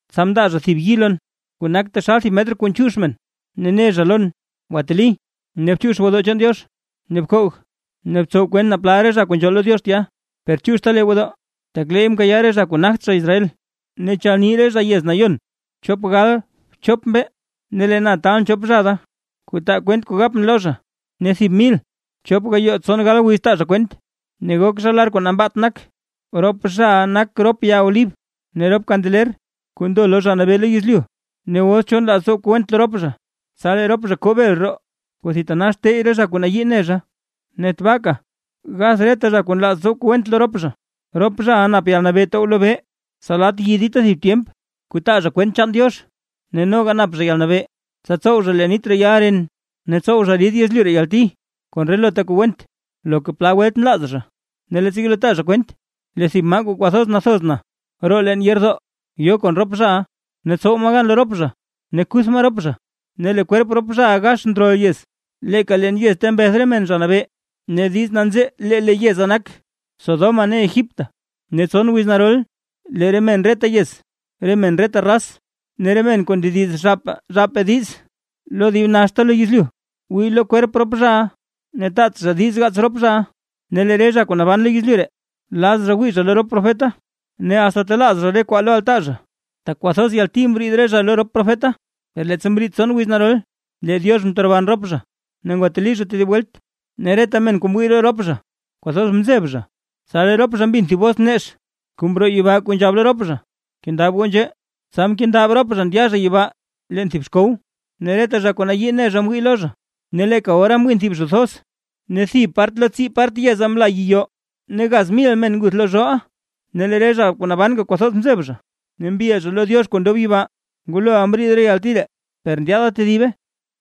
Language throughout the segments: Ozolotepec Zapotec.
Tsa mndaa zha thib yi lon kuu nak taxal thib metr kuu nchiix men, ne ne zha lon: ―Gwateli, ne bchiix gwodoo chaan Diox, ne bkoog ne btsow kwent naa plal re zha kuu nzhool lo Diox tya. Per chiixta lee gwodoo, tak leey mkayaaʼa re zha kuu nagt zha Israel, ne chalni re zha yez nayon chop gal bchop mbee. Ne lee na taalʼn chop zha da, kuu taa kwent kuu gapʼn lo zha, ne thib mil chop gayoo tson gal wiz taa zha kwent, ne gok zha lar kuu nambaat nak. Rop zhaʼa nak rop ya olib ne rop kandeler kuu ndo lo Zha Nabee lo yezlyu. Ne os cho nlaaz tsow kuu went lo rop zha, tsa lee rop zha koo bel roo, kuu thitanax tey re zha kuu nayii ne zha, ne tbaaka gath reta zha kuu nlaaz tsow kuu went lo rop zha. Rop zhaʼa nap yalnabee tow lobee, tsa lat yi dita thib tyemp kuu taa zha kwent chaan Diox; ne noga nap zha yalnabee, tsa tsow zha lee nit reyal ren, ne tsow zha rid yezlyu ree yalti kon relota kuu went, loka plal welt nlaaz zha. Ne leettsa yelo taa zha kwent, lee thib maa kuu kwathoz nathoz na roo leen yeerdoo, yo kon rop zhaʼa, ne tsow maa gan lo rop zha ne kuth maa rop zha. Ne lee kwerp rop zhaʼa gax ndrol yez, leeka leen yez ta mbeth re men Zha Nabee, ne diiz nanzee lee le yeza nak Sodoma ne Egipto. Ne tson wiz narol, lee re men reta yez, re men reta raz, ne re men kuu ndediz zhaapaa zhaapaa diiz lo dib naxta lo yezlyu, wii lo kwerp rop zhaʼa ne taat zha diiz gaats rop zhaʼa. Ne lee re zha kuu naban lo yezlyu ree, laz zha wii zha lo rop profeta, ne asta talaaz zha re kwaa lo altaa zha; tak kwathoz yalti mriid re zha lo rop profeta. Per leettsa mriid tson wiz narol, lee Diox mteroban rop zha ne ngwateli zha tedib welt, ne reta men kuu mwii lo rop zha, kwathoz mzeb zha. Tsa lee rop zha mbin thib bos nex kuu mroo yibaa kuu nzhab lo rop zha: ―¡Kendab goo nzhee! Tsa mkendab rop zha ndya zha yibaa leen thib xkow, ne reta zha kuu nayii ne zha mwii lo zha. Ne leeka ora mwin thib zho thoz, ne thib part lo tsii part yeza mla yiyoo ne gaz mil men nguth lo zhoʼa. Ne lee re zha kuu nabanka kwathoz mzeb zha ne mbil zha lo Diox kuu ndob yibaa. Nguloʼa mriid re yalti ree; per ndyaada tedibe.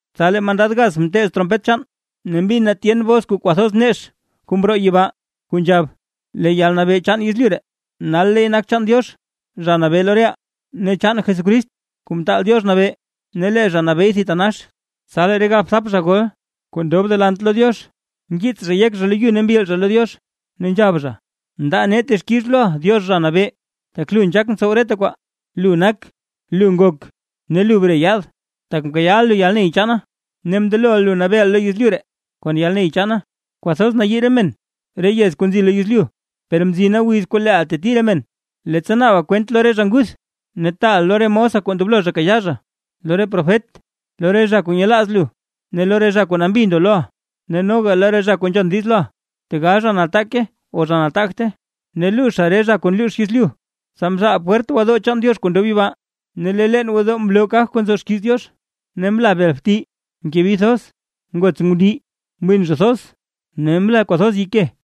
Tsa lee mandad gaz mteez trompet chaan, ne mbin na tyen bos kuu kwathoz nex kuu mroo yibaa, kuu nzhab: Lee yalnabee chaan yezlyu ree, nal leey nak chaan Diox, Zha Nabee lo reʼaa, ne chaan Jesucrist, Kuu Mtaal Diox Nabee, ne lee zha nabeey thitanax. Tsa lee re galbthap zha gol kuu ndob delant lo Diox, mkiits zha yek zha lo yu ne mbil zha lo Diox, ne nzhab zha: Ndaa nee texkix loʼa Diox, Zha Nabee, tak lu nzhaak ntsow reta kwaa, lu nak, lu ngok ne lu bre yaad, tak mkayaaʼa lu yalney chaana, ne mndeloʼa lu nabeeʼa lo yezlyu ree kon yalney chaana. Kwathoz nayii re men re yez kuu nzi lo yezlyu, per mzina wiz kuu leeʼa teti re men, leettsa naaba kwent lo re zha nguth. Ne taaʼa lo re mosa kuu ndoblo zha kayaa zha, lo re profet, lo re zha kuu nyelaaz lu ne lo re zha kuu nambi ndo loʼa, ne noga lo re zha kuu nzhon diiz loʼa, tegal zha nataake o zha nataagte, ne luuzha re zha kuu nluux yezlyu. Tsa mzhaal pwert gwodoo chaan Diox kuu ndob yibaa, ne lee leen gwodoo mloo kaj kuu nzo xkiiz Diox. Ne mla bel bti, mke bi thoz, ngots ngundii, mwin zho thoz ne mla kwathoz yike.